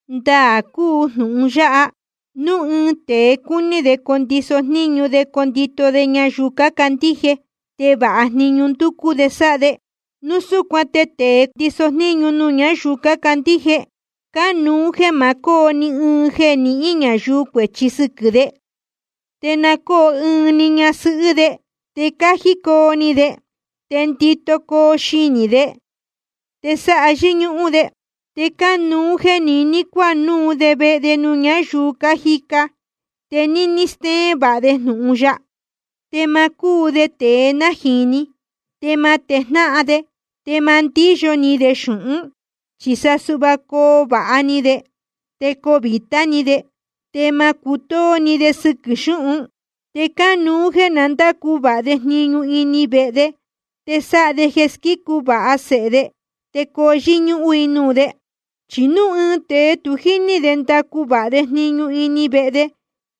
Ndaā cúu jnūhun yáha: Núu ɨɨn tēe cúní de condiso jníñu de condito de ñayuu cácandíje, te vāha jniñu ndúcú de sáha de. Núu súcuan te tēe ndíso jníñu nuū ñáyuu cácandíje, cánuú jeē ma cóo ni ɨɨn jeē nihín ñayuu cuēchi sɨquɨ̄ de. Te na cóo ɨɨn‑ni ñasɨhɨ́ de, te cájí coo ni de, te ndito coo xinī de, te sáha yɨ́ñúhún de. Te cánuú jeē niní cuanúu de vehe nuū ñáyuu cájica, te níní stéén vāha de jnūhun ya. Te ma cúu de tēe nájīni, te ma tejnáhan de, te ma ndíyo ni de xūhún. Chi sa suhva coo vāha ni de, te coo vītá ni de, te ma cutóó ni de sɨquɨ̄ xúhun. Te cánuú jéē na ndácu vāha de jniñu ini vehe de, te sáha de jeē squícu vāha sēhe de te coo yɨ́ñúhún i nuū de. Chi núu ɨɨn tēe tu jíní de ndacu vāha de jniñu ini vehe de,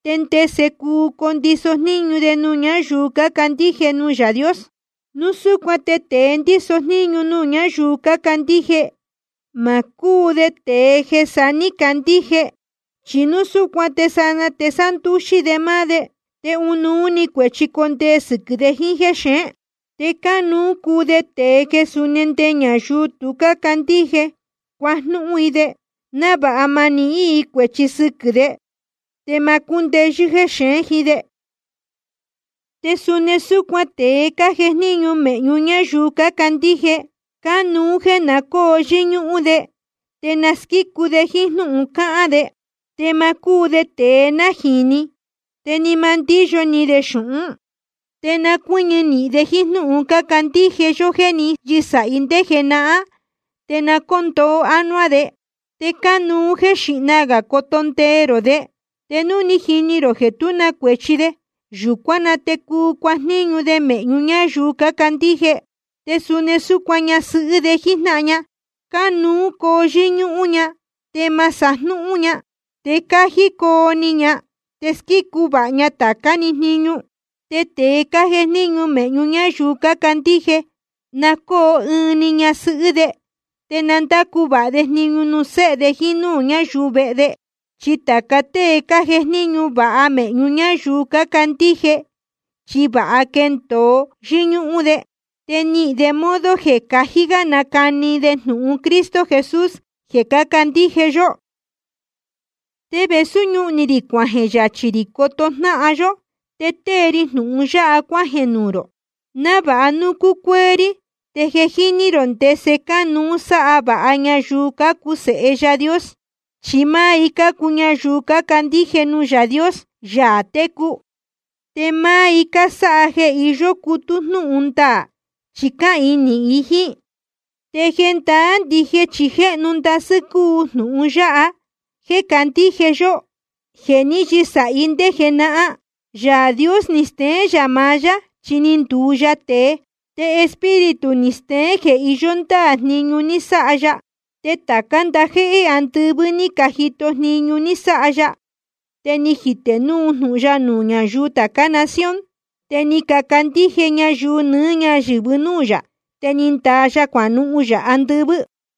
¿te ndese cuu condiso jníñu de nuū ñáyuu cácandíje nuū Yaā Dios? Núu súcuan te tēe ndíso jníñu nuū ñáyuu cácandíje, ma cúu de tēe jeē saá ní candíje, chi núu súcuan te sanaa te sándúxí de máá de, te ɨnuú‑ni cuēchi jecondee sɨquɨ̄ de jíín jéxeén. Te cánuú cuu de tēe jeē suni nde ñayuu tu cácandíje, cuajnúhún i de, návāha ma nihín i cuēchi sɨquɨ̄ de, te ma cúndeyɨ́ jexeén jíín de. Te suni súcuan tēe cájejníñu mēhñu ñáyuu cácandíje, cánuú jéē na cóo yɨ́ñúhún de, te na squícu de jíín jnúhun cáhán de. Te ma cúu de tēe nájīni, te ni ma ndíyo ni de xūhún. Te na cuɨ́ñɨ nīhin de jíín jnúhun cándíje yó jéē ní yɨsāhi ndé jenahán, te na cóo ndoo anuá de. Te cánuú jéē xíhna gā coto ndee rō de, te núu ni jini rō jeē tú na cuēchi de, yūcuán na te cuu cuajníñu de mēhñu ñáyuu cácandíje. Te suni súcuan ñasɨhɨ́ de jíjnáhan ña, cánuú coo yɨ́ñúhún ña, te ma sajnúhún ña, te cájí coo ni ña, te squícu vāha ña tācá‑ni jniñu. Te tēe cájejníñu mēhñu ñáyuu cácandíje, na cóo ɨɨn‑ni ñasɨhɨ́ de, te na ndácu vāha de jniñu nuū séhe de jíín núū ñáyuu vehe de. Chi tāca tée cájejníñu vāha mēhñu ñáyuu cácandíje, chi vāha quéndōo yɨ́ñúhún de, te níhín de modo jeē cají gá nácani de jnūhun Cristo Jesús jeē cácandíje yó. Te vēsú ñúhun ni rī cuajeē yachī rī coto jnáhan yó, te tée ri jnūhun yáha cuájeē nuū rō, návāha núu cucuéé rí, te je jíní rō ndese cánuú sáha vāha ñayuu cácuu sēhe Yaā Dios. Chi máá i cácuu ñayuu cácandíje nuū Yaā Dios, Yaā técu. Te máá i cásáha jeē iyó cutú jnúhun ndaā, chi cáhīin nīhin i jíín. Te jendaá ndije chi jéhnu ndasɨ́ cúu jnūhun yáha jeē cácandíje yó, jeē ní yɨsāhi ndé jenahán: Yaā Dios ni steén yā maá yá, chi ni nduu ya tēe, te Espíritu ni steén jeē iyó ndáā jniñu ni sáha ya, te tācá ndajéhé andɨvɨ́ ní cajito jniñu ní sáha ya. Te ni jitē núu jnūhun ya nuū ñáyuu tācá nación, te ni cacandíje ñayuu nɨɨ́ ñáyɨ̄vɨ núū yā, te ni ndaa ya cuanuhun yā andɨvɨ́.